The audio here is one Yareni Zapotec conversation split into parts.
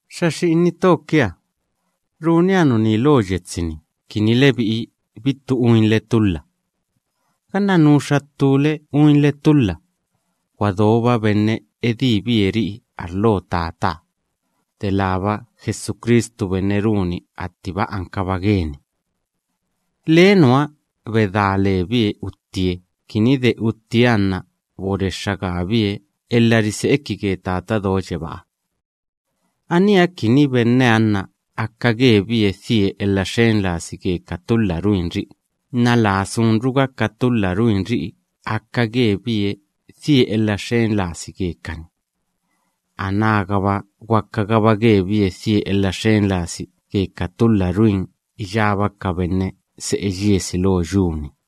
Xa xi'ini to kia, runia nuní lo yetsi‑ni kini lebi'i bittu uinle tulha. Ganna nuxa ttúle uinle tulha, gwa doba benne edíbie ri'i arlo Tataha, delába Jesucristu benne runi attiba ankaba geni. Lee nuha bedá lebie uttie kini de uttieha nna borexxa gaabie elha rise'iki ge Tata Do Yebáha. Aníha kini benneha nna aka gebie dhie elha xen lasi ge ka tulha ruinri'i nna laa sunruga ka tulha ruinri'i aka gebie dhie elha xen lasi gekani, anágaba gwakagaba gebie die elha xen lasi ge ka tulha ruin iyába ka benne se'e yiesi lo yu‑ni.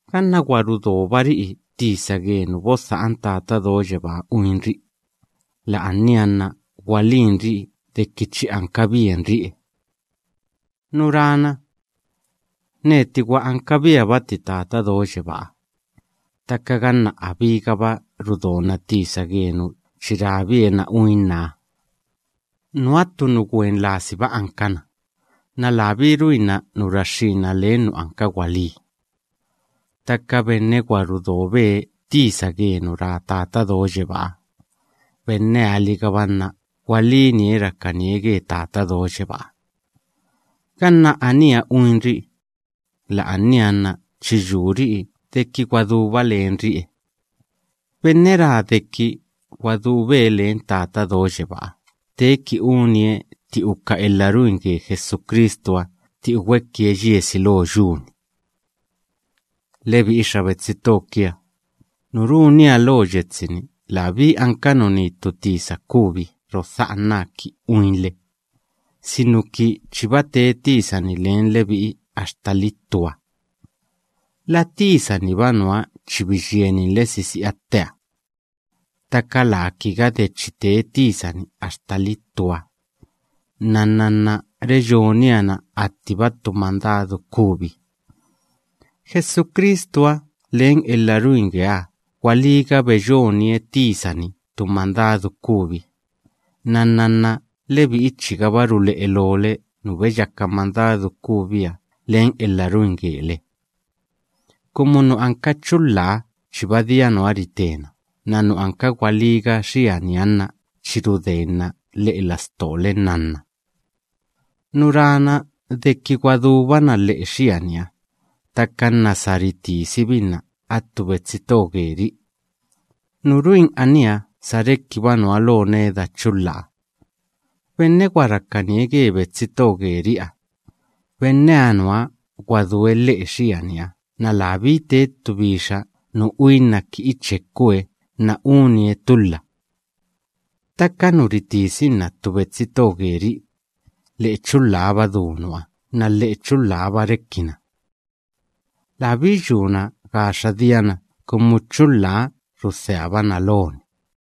Ganna gwa rudobari'i tisa ge nu bodha'an Tata Do Yebáha uinri'i, la'ania nna gwalínri'i deki chi ankabienri'e. Nu rana: “Neti gwa ankabiabati Tata Do Yebáha”, ttaka ganna abígaba rudona tisa ge nu chi rabie na uinnaha, nuha ttu nu gwen lasiba ankana, nna labí ruinna nu raxxína len nu anka gwalí. Ttaka benne gudobie tisa ge nu ra Tata Do Yebáha, benneha‑ligaba nna gwalínie rakanie ge Tata Do Yebáha. Ganna aníha uinri'i, la'ania nna chi yuri'i deki gwa duba lenri'e. Benne ra deki gwa dube len Tata Do Yebáha teeki unie tti uka elha ruin ge Jesucristuha tti ugwekie yiesi lo yu‑ni. Lebi'i xa betsi to kia, nu runia lo yetsi‑ni labí anka nuní ttu tisa kubi rodha'anaa ki uinle, sinuki chiba tee tisa‑ni len lebi'i axtali ttuha. La tisa‑niba nuha chi biyieninle sisi'a tteha. Ttaka laa kiga de chi tee tisa‑ni axtali ttuha, nnanna nna reyonia na attiba ttu mandadu kubi. Jesucristuha len elha ruin geeha gwalíga beyonie tisa‑ni ttu mandadu kubi, nnanna nna lebi'i chigaba rule'e loole nu beyaka mandadu kubiha len elha ruin gele. Kumu nu anka chulhaha chiba dia nuha ritena nna nu anka gwalíga xianiha nna chi rudenna lhe'e lastole nnanna. Nu rana deki gwa dúbana lhe'e xianiha, ttaka nna sa ritisibinna attu betsi to geri'i, nu ruin aníha sa rekiba nuha lo neda chulhaha. Benne gwa rakanie ge betsi to geri'iha, benneha nuha gwa due lhe'e xianiha nna labí tee ttu bixa nu uinna ki ichekue nna unie tulha. Ttaka nu ritisinna ttu betsi to geri'i, lhe'e chulhaba du nuha nna lhe'e chulhaha‑ba rekina. Labí yuna gaxa diana kumu chulhaha rudheabana loni.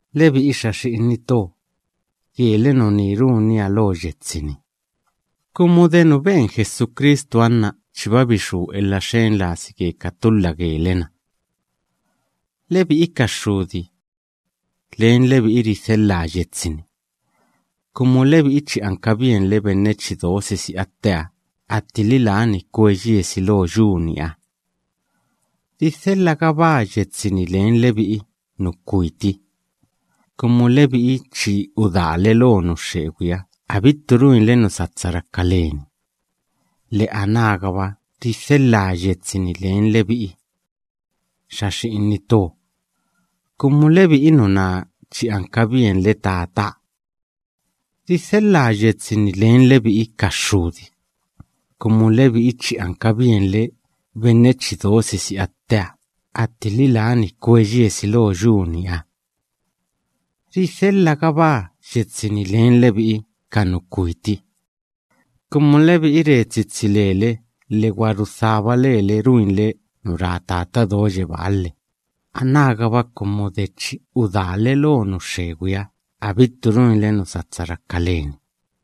Lebi'i xa xi'ini to, gele nuní runia lo yetsi‑ni, kumu de nu ben Jesucristuha nna chiba bixú elha xen lasi ge ka tulha gele‑na. Lebi'i ka xxudi, len lebi'i ridhelhaa yetsi‑ni, kumu lebi'i chi ankabienle benne chi do sisi'a tteha attili lani kwe yiesi lo yu‑niha. Ridhelhagabaa yetsi‑ni len lebi'i nu kwiti, kumu lebi'i chi udaale lo nu xxegwiha abittu ruinle nu satsa raka leni, lhe anágaba ridhelhaa yetsi‑ni len lebi'i xa xi'ini to, kumu lebi'i nuná chi ankabienle Tataha. Ridhelhaa yetsi‑ni len lebi'i ka xxudi, kumu lebi'i chi ankabienle benne chi do sisi'a tteha attili lani kwe yiesi lo yu‑niha. Ridhelhagabaa yetsi‑ni len lebi'i ka nu kwiti, kumu lebi'i re tsitsi lele lhe gwa rudhába lele ruinle nu ra Tata Do Yebáha, lhe anágaba kumu de chi udaale lo nu xxegwiha abittu ruinle nu satsa raka leni.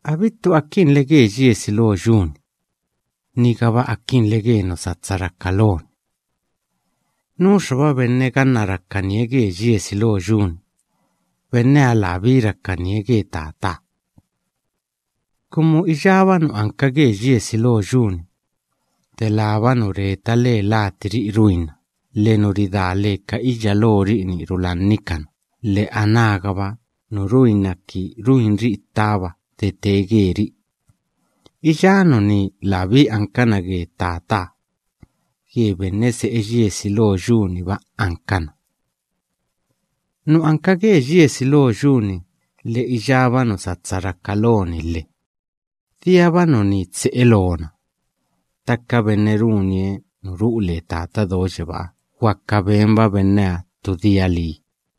Abittu akinle ge yiesi lo yu‑ni, nigaba akinle ge nu satsa raka loni. Nuxaba benne ganna rakanie ge yiesi lo yu‑ni, benneha labí rakanie ge Tataha. Kumu iyába nu anka ge yiesi lo yu‑ni, delába nu reta le latiri'i ruinna lhe nu ridá le ka iyya lori'i‑ni rulannikana lhe, anágaba nu ruinna kini ruinri'i ttaba de tee geri'i, iyá nuní labí ankana ge Tataha; ge benne se'e yiesi lo yu‑niba ankana. Nu anka ge yiesi lo yu‑ni lhe iyába nu satsa raka loni lhe, diaba nuní tse'e loona; ttaka benne runie nu ru'u le Tata Do Yebáha gwaka benba benneha ttu dia lii.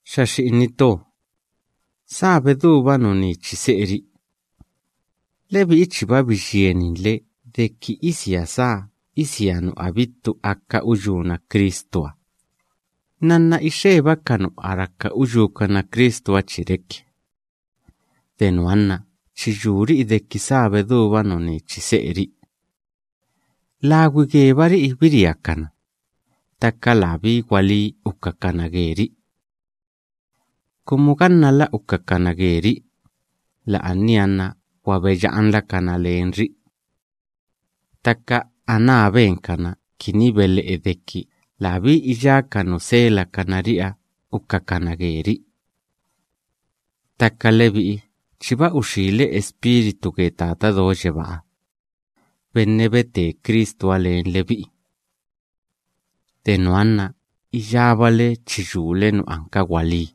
Xa xi'ini to, sá bedúba nuní chi se'eri'i. Lebi'i chiba biyieninle deki isia sá isia nu abittu aka uyúna Cristuha, nnanna ixeba ka nu a raka uyúkana Cristuha chi reki. De nuha nna chi yuri'i deki sá bedúba nuní chi se'eri'i. Lagwi gebari'i biriakana, ttaka labí gwalí ukakana geri'i. Kumu gannala ukakana geri'i, la'ania nna gwa beya'anlakana lenri'i. Ttaka aná benkana kini bele'e deki labí iyá ka nu selakana ri'iha ukakana geri'i. Ttaka lebi'i chiba uxíle Espíritu ge Tata Do Yebaa benne bete Cristuha len lebi'i. De nuha nna iyábale chi yule nu anka gwalí.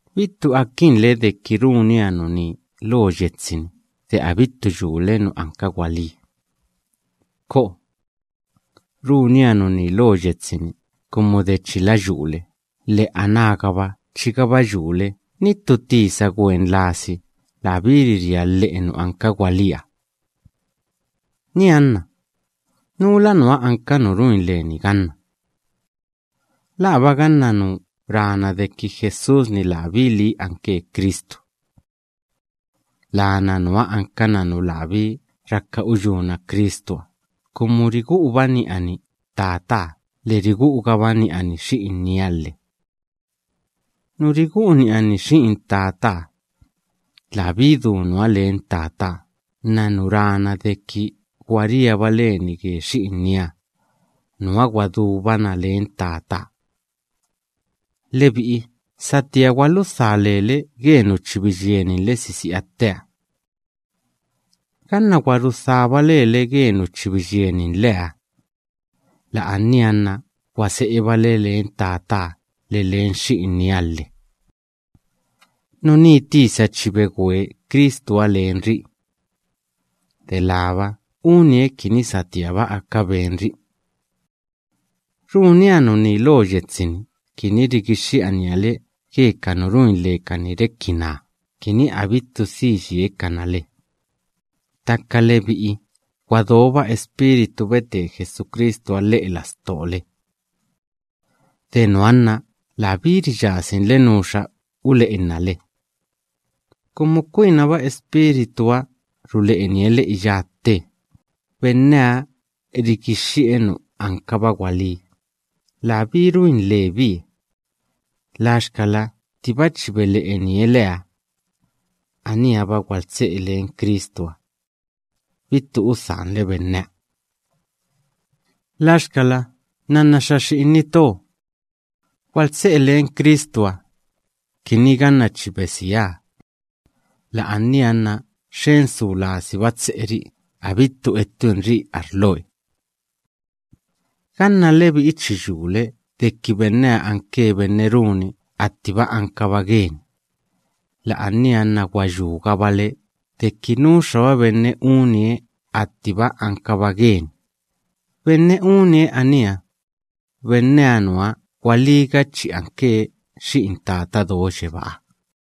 Bittu akinle deki runia nuní lo yetsi‑ni de abittu yule nu anka gwalí. ¡Ko'o! Runia nuní lo yetsi‑ni kumu de chila yule lhe anágaba chigaba yule ni ttu tisa gwen lasi labí riria lhe'e nu anka gwalíha. Nianna, ¿núla nuha anka nu ruin leni ganna? ¿Laaba ganna nu rana deki Jesús‑ni labí lii anke Cristu? Lana nuha ankana nu labí raka uyúna Cristuha, kumu rigu'uba ni'ani Tataha lhe rigu'ugaba ni'ani Xi'inieha lhe. Nu rigu'u ni'ani Xi'in Tataha, labí du nuha len Tataha nna nu rana deki gwa riaba leni ge Xi'inieha, nuha gwa dúbana len Tataha. Lebi'i satía gwaludhá lele ge nu chi biyieninle sisi'a tteha. Ganna gwa rudhába lele ge nu biyieninleha, la'ania nna gwa se'ebale len Tataha lhe len Xi'inieha lhe. Nuní tisa chi begwe Cristuha len ri'i, delába unie kini satíaba aka benri'i. Runia nuní lo yetsi‑ni kini rigixxi'ania le ge ka nu ruin lekani reki naa, kini abittu dhi yiekana le. Ttaka lebi'i gwa doba Espíritu bete Jesucristuha lhe'e lastole. De nuha nna labí riyasinle nuxa ule'enna le, kumu kwinaba Espírituha rule'enie le iyá tte. Benneha rigixxi'e nu ankaba gwalí, labí ruin lebie. Laxkala ttiba chi bele'enie leha, aníha‑ba gwaltse'e len Cristuha, bittu udhanle benneha. Laxkala nnanna xa xi'ini to, gwaltse'e len Cristuha, kini ganna chi besieha, la'ania nna xen su lasiba tse'eri'i abittu ettuinri'i arloe. Ganna lebi'i chi yule deki benneha anke benne runi attiba ankaba geni, la'ania nna gwa yúgabale deki nuxaba benne unie attiba ankaba geni, benne unie aníha, benneha nuha gwalíga chi anke xi'in Tata Do Yebáha.